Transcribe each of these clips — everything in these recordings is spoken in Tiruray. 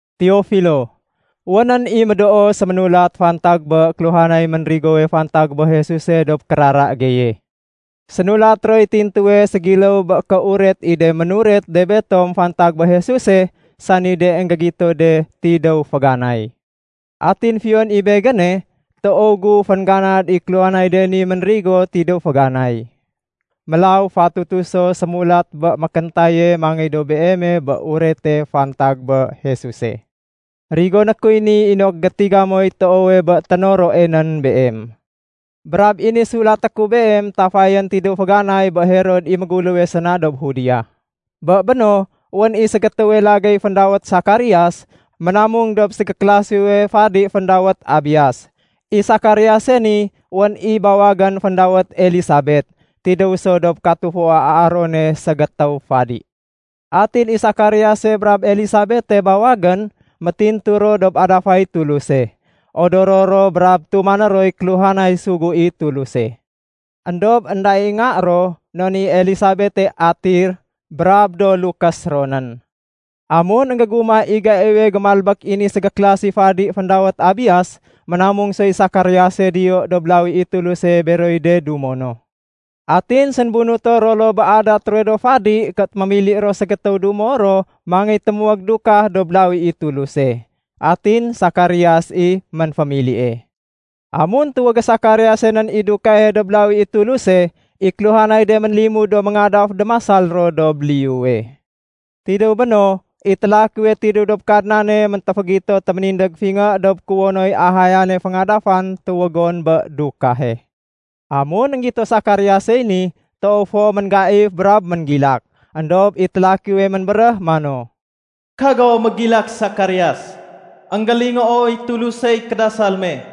Teofilo, Wénén i médoo séménulat fantag bé kéluhanay ménrigowe fantag bé Jesuse dob kérara geye. Sénulat roy tintuwe ségiléw bé kéuret i de ménuret de betom fantag bé Jesuse, sani de énggégito de tidéw féganay. Atin fiyon i begéne, toow gu féngganad i kéluhanay de ni ménrigo tidéw féganay. Mélaw fatutu so sémulat bé mékéntaye mangéy dob beeme bé urete fantag bé Jesuse. Rigoné kuy ni inok gétiga moy toowe bé ténoroe nén beem. Brab i ni sulaté ku beem tafayén tidéw féganay bé Herod i méguléwe séna dob Judea. Bé béno, wén i ségétéwe lagéy féndawét Sakarias, ménamung dob ségéklasiwe fadi féndawét Abias. I Sakariase ni, wén i bawagén féndawét Elisabet. Tidéw so dob katufua Aarone ségétéw fadi. Atin i Sakariase brab Elisabete bawagén, métintu ro dob adafay Tuluse. Odoro ro brab tumané roy kéluhanay sugu i Tuluse. Endob énda i nga ro, non i Elisabete atir, brab do lukés ro nén. Amun énggégumah i gaiwe gémalbék i ni ségéklasi fadi féndawét Abias, ménamung soy Sakariase diyo dob lawi i Tuluse beroy de dumo no. Atin sénbunuto ro loo bé adat ruwe do fadi ké mémili ro ségétéw dumo ro mangéy témuwég dukah dob lawi i Tuluse. Atin Sakarias i ménfémilie. Amun tuwégé Sakariase nén i dukahe dob lawi i Tuluse, i kéluhanay de ménlimud do méngadaf déménasal ro dob liyuwe. Tidéw béno, i télakiwe tidéw dob Kadnane méntéfégito téménindég fingé dob kuwonoy ahayane féngadafan tuwégon bé dukahe. Amun énggito Sakariasey ni, toow fo ménggaif brab ménggilak. Endob i télakiwe ménbéréh mano, “Kago mégilak Sakarias. Enggélingooy Tulusey kédasal me.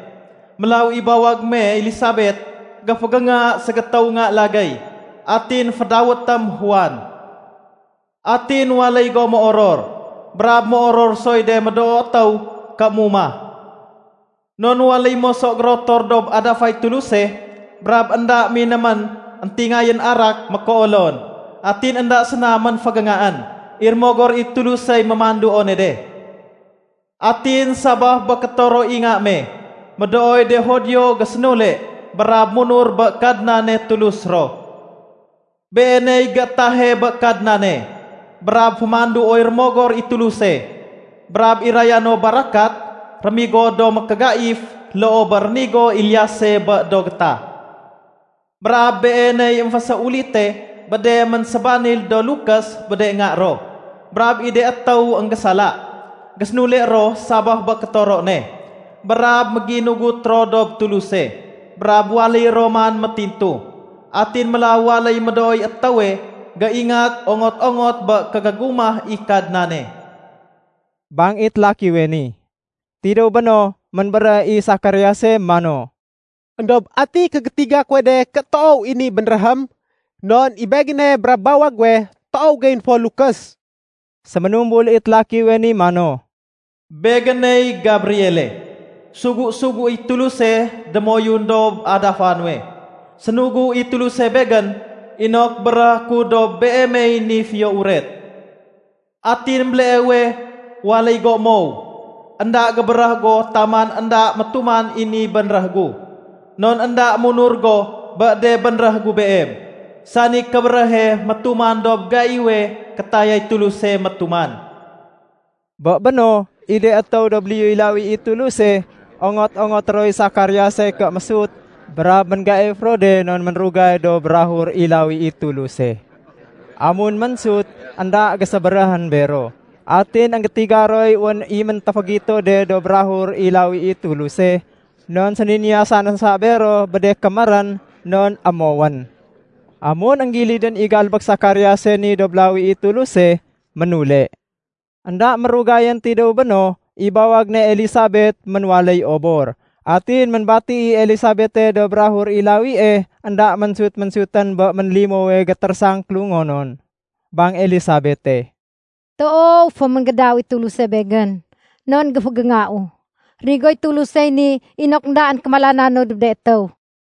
Mélaw i bawag me Elisabet géfégénga ségétéw nga lagéy. Atin fédawétém Juan. Atin waléy go méoror brab méoror soy de médoo étéw ké mumah. Non waléy moso gérotor dob adafay Tuluse brab énda minémén éntingayén arak mékéolon. Atin énda séna ménfégéngaén, i Rémogor i Tulusey mémanduone de. Atin sabaf bé kétoro i nga me, médooy de Judio gésénule brab munur bé Kadnane Tulus ro. Beeney géétahe bé Kadnane brab fémanduoy Rémogor i Tuluse brab iraya no barakat rémigo do mékégaif loo bé rénigo Eliase bé do gétah. Brab beeney émféséulite bé de ménsébanil do lukés bé de nga ro. Brab i de étéw énggésala, gésénule ro sabaf bé kétoro ne, brab méginugut ro dob Tuluse, brab waléy ro man métintu. Atin mélaw waléy médooy étéwe géingat ongot-ongot bé kégégumah i Kadnane,” bang i télakiwe ni. Tidéw béno, ménbéréh i Sakariase mano, “Endob ati kégétiga kuwe de ké toow i ni bénréhém? Non i begéne brab bawag guwe toow geyén fo lukés.” Séménumbul i télakiwe mano, “Begéney Gabriele, sugu-suguéy Tuluse démoyun dob adafa nuwe. Sénugu i Tuluse begén inok béréhé ku dob beemey ni fiyo uret. Atin béleewe waléy go émow. Enda gébéréh go taman énda métuman i ni bénréh gu, non énda munur go bé de bénréh gu beem, sani kébéréhe métuman dob gaiwe kétayay Tuluse métuman.” Bé béno, i de étéw dob liyuy lawi i Tuluse, ongot-ongoté roy Sakariase ké mésut, brab ménggaif ro de non ménrugay dob bukag i lawi i Tuluse. Amun ménsut, énda gésébéréhén bero. Atin énggétiga roy wén i méntéfégito de dob bukag i lawi i Tuluse, non séniniyasa no sa bero bé de kémérén, non émowén. Amun énggilidén i galbék Sakariase ni dob lawi i Tuluse, ménule. Enda mérugayén tidéw béno, i bawag ne Elisabet ménwaléy obor. Atin ménbati i Elisabete dob bukag i lawie, énda ménsut-sutén bé ménlimowe gétérésang kélungonon. Bang Elisabete, “Toow fo mégédaw i Tuluse begén, non géfégéngau. Rénigoy Tulusey ni inok éndaén kémalananu dob de étéw.”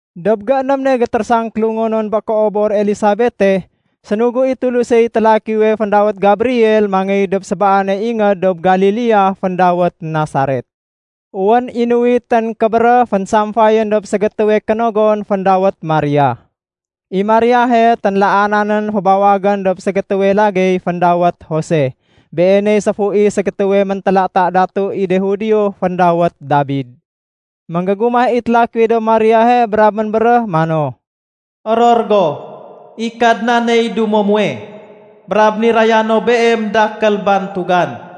Dob gééném ne gétérésang kélungonon bé kéobor Elisabete, sénugu i Tulusey télakiwe féndawét Gabriel mangéy dob sébaane ingéd dob Galilea féndawét Nasaret. Wén i nuwitén kébéréh fénsamfayén dob ségétéwe kénogon féndawét Maria. I Mariahe ténlaana nén fébawagén dob ségétéwe lagéy féndawét Jose. Beeney séfu i ségétéwe méntélata datu i de Judio féndawét Dabid. Ménggégumah i télakiwe dob Mariahe brab ménbéréh mano, “Oror go! I Kadnaney dumo muwe, brab niraya no beem dakél bantugan.”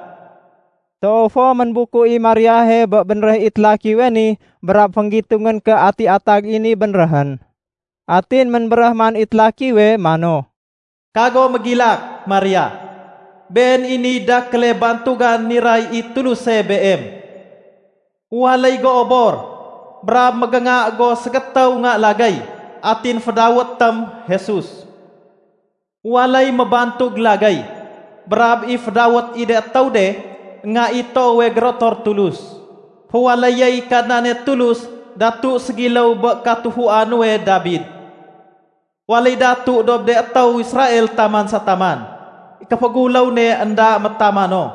Toow fo ménbuku i Mariahe bé bénréh i télakiwe ni, brab fénggitungén ké ati atag i ni bénréhén. Atin ménbéréh man i télakiwe mano, “Kago mégilak, Maria. Been i niy dakéle bantugan niray i Tuluse beem. Waléy go obor, brab mégénga go ségétéw nga lagéy, atin fédawétém Jesus. Waléy mébantug lagéy brab i fédawét i de étéw de Nga i Toowe Gérotor Tulus. Féwaléyéy Kadnane Tulus datu ségiléw bé katufua nuwe Dabid. Waléy datu dob de étéw Israel taman sa taman. I kéféguléw ne énda métamano.”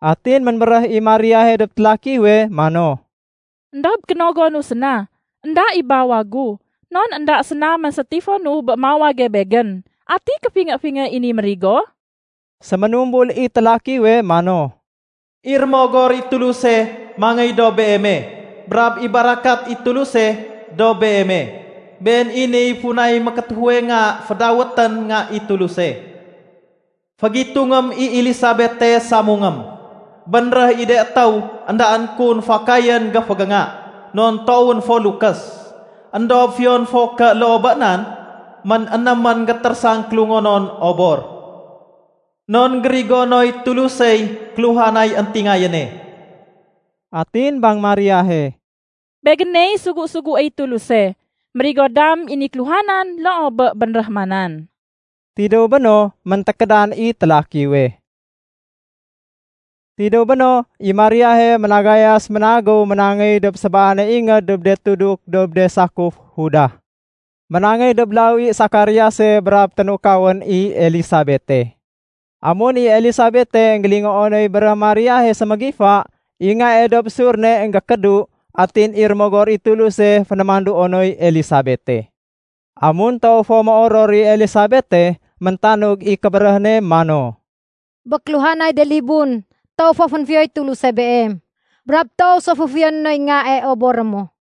Atin ménbéréh i Mariahe dob télakiwe mano, “Endob kénogonu séna, énda i bawag gu, non énda séna ménsétifonu bé mawage begén. Ati kéfingé-fingé i ni mérigo?” Séménumbul i télakiwe mano, “I Rémogor i Tuluse mangéy dob beeme brab i barakat i Tuluse dob beeme. Been i niy funay mékétéfuwe nga fédawétén Nga i Tuluse. Fégitungém i Elisabete samungém. Bénréh i de étéw éndaén kun fakayén géfégénga, non toowén fo lukés. Endob fiyon fo ké loo bé nan, mén-énémén gétérésang kélungonon obor. Non gérigonoy Tulusey kéluhanay éntingayéne.” Atin bang Mariahe, “Begéney sugu-suguéy Tuluse. Mérigo dam i ni kéluhanan loo bé bénréh manan.” Tidéw béno, méntékédan i télakiwe. Tidéw béno, i Mariahe ménagayas ménagéw ménangéy dob sébaane ingéd dob de tuduk dob de sakuf Juda. Ménangéy dob lawi Sakariase brab ténukawén i Elisabete. Amun i Elisabete énggélingoo noy béréh Mariahe sémégifa, i ngae dob ésur ne énggékédu, atin i Rémogor i Tuluse fénémanduo noy Elisabete. Amun toow fo méoror i Elisabete, méntanug i kébéréh ne mano, “Bé kéluhanay de libun, toow fo fénfiyoy Tuluse beem, brab toow so fo féfiyoné noy ngae oboré mo.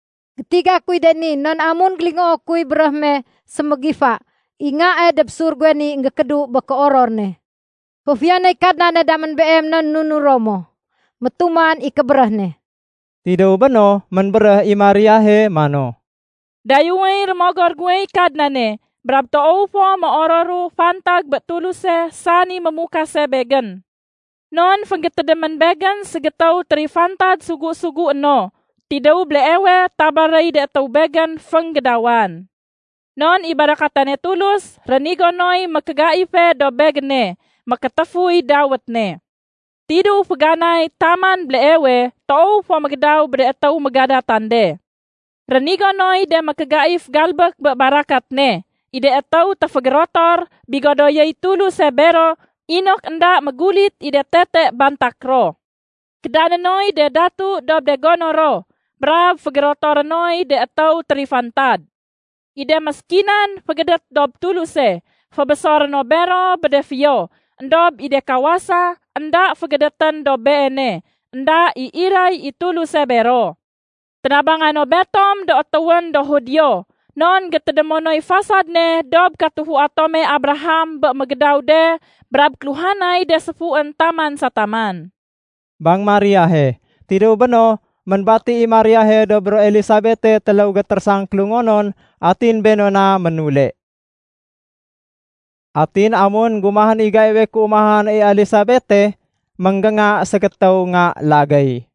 Gétiga kuy de ni non amun énggélingoo kuy béréh me sémégifa, i ngae dob ésur guwe ni énggékédu bé kéoror ne. Féfiyonéy Kadnane damén beem non nunuro mo métuman i kébéréh ne.” Tidéw béno, ménbéréh i Mariahe mano, “Dayéwéy rémogor guwey Kadnane, brab toow fo méororu fantag bé Tuluse sani Mémukase begén. Non fénggétédémén begén ségétéw térifantad sugu-sugué no. Tidéw béleewe tabaréy de étéw begén fénggédawan. Non i barakatane Tulus rénigo noy mékégaife dob begéne. Mékétéfuy dawét ne. Tidéw féganay taman béleewe, toow fo mégédaw bé de étéw mégadatan de. Rénigo noy de mékégaif galbék bé barakat ne. I de étéw téfégérotor, bigodoyéy Tuluse bero inok énda mégulit i de tete bantak ro. Kédané noy de datu dob de gono ro, brab fégérotoré noy de étéw térifantad. I de méskinan fégédét dob Tuluse, fébésoré no bero bé de fiyo. Endob i de kawasa énda fégédétén dob Beene, énda i iray i Tuluse bero. Ténabanga no betom do étéwén do Judio, non gétédémo noy fasad ne dob katufua tome Abraham bé mégédaw de brab kéluhanay de séfuén taman sa taman,” bang Mariahe. Tidéw béno, ménbati i Mariahe dob ro Elisabete téléw gétérésang kélungonon, atin béno na ménule. Atin amun énggumahén i gaiwe kéumahan i Elisabete, ménggénga ségétéw nga lagéy.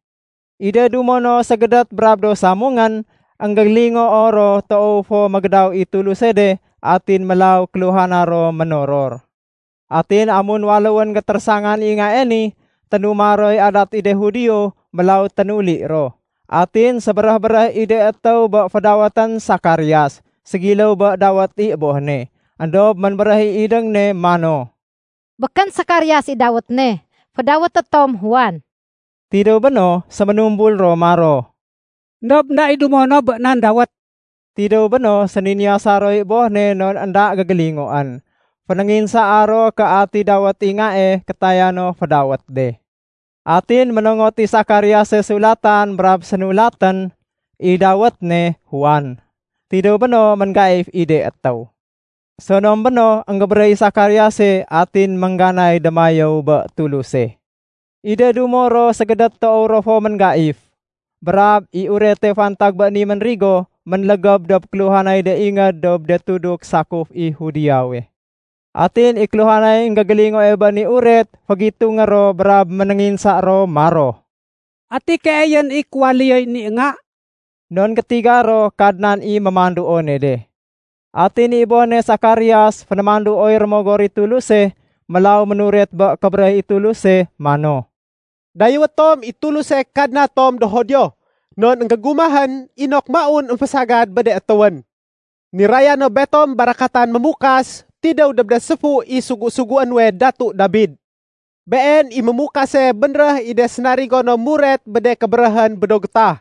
I de dumo no ségédét brab do samungén, énggélingoo ro toow fo mégédaw i Tuluse de, atin mélaw kéluhana ro ménoror. Atin amun waléwén gétérésangan i ngae ni, ténuma roy adat i de Judio, mélaw ténuli ro. Atin sébéréh-béréh i de étéw bé fédawétén Sakarias, ségiléw bé dawét i boh ne. Endob ménbéréh i idéng ne mano, “Békén Sakarias i dawét ne. Fédawété tom Juan.” Tidéw béno, séménumbul ro maro, “Endob énda i dumo no bé nan dawét.” Tidéw béno, séniniyasa roy boh ne non énda gégélingoén. Fénénginsaa ro ké ati dawét i ngae kétaya no fédawét de. Atin ménongot i Sakariase sulatan brab sénulatén, “I dawét ne Juan.” Tidéw béno ménggaif i de étéw. Sonom béno, énggébéréh i Sakariase, atin méngganay démayéw bé Tuluse. I de dumo ro ségédét toow ro fo ménggaif. Brab i urete fantag bé ni ménrigo, ménlégéb dob kéluhanay de ingéd dob de tuduk sakuf i Judeawe. Atin i kéluhanay énggégélingoe bé ni uret fégitungé ro brab ménénginsa ro maro, “Ati keeyén i kéwaléyoy ni nga?” Non gétiga ro Kadnan i mémanduone de. Atin i boh ne Sakarias fénémanduoy Rémogor i Tuluse, mélaw ménuret bé kébéréh i Tuluse mano, “Dayéwé tom i Tuluse Kadna tom do Judio, non énggégumahén inok maun émfésagad bé de étéwén. Niraya no betom barakatan Mémukas tidéw dob de séfu i sugu-sugué nuwe Datu Dabid. Been i Mémukase bénréh i de sénarigo no muret bé de kébéréhén bé do gétah.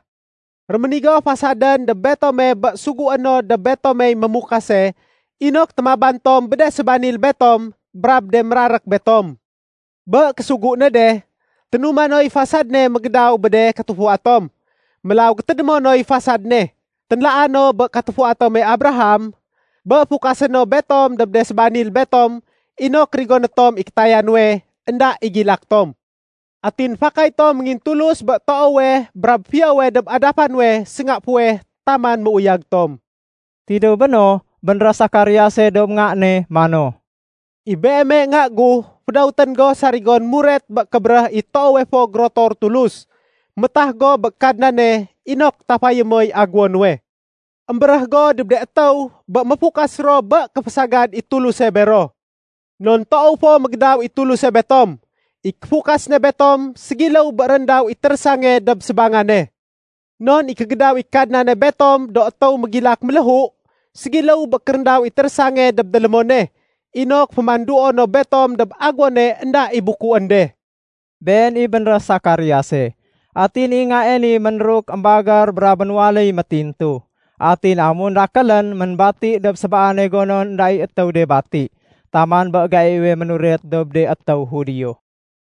Réménigo fasadén dob betome bé sugué no dob betomey Mémukase inok témaban tom bé de sébanil betom brab de mérarék betom. Bé késugu ne de, ténuma noy fasad ne mégédaw bé de katufua tom. Mélaw gétédémo noy fasad ne, ténlaa no bé katufua tome Abraham, bé fukasé no betom dob de sébanil betom inok rigoné tom i kétaya nuwe, énda i gilak tom. Atin fakay tom méngintulus bé toowe brab fiyowe dob adafa nuwe sénga fuweh taman méuyag tom.” Tidéw béno, bénréh Sakariase dob nga ne mano, “I beeme nga gu fédawétén go sarigon muret bé kébéréh i Toowe Fo Gérotor Tulus. Métah go bé Kadnane inok tafayé moy aguwo nuwe. Embéréh go dob de étéw bé méfukas ro bé kéfésagad i Tuluse bero. Non toow fo mégédaw i Tuluse betom. I kéfukas ne betom ségiléw bé réndaw i térésange dob sébangane. Non i kégédaw i Kadnane betom do étéw mégilak méléhu, ségiléw bé kéréndaw i térésange dob délémone, inok fémanduo no betom dob aguwone énda i bukuén de.” Been i bénréh Sakariase. Atin i ngae ni ménruk émbagér brab ménwaléy métintu. Atin amun dakélén, ménbati dob sébaane gonon énda i étéw de bati, taman bé gaiwe ménuret dob de étéw Judio.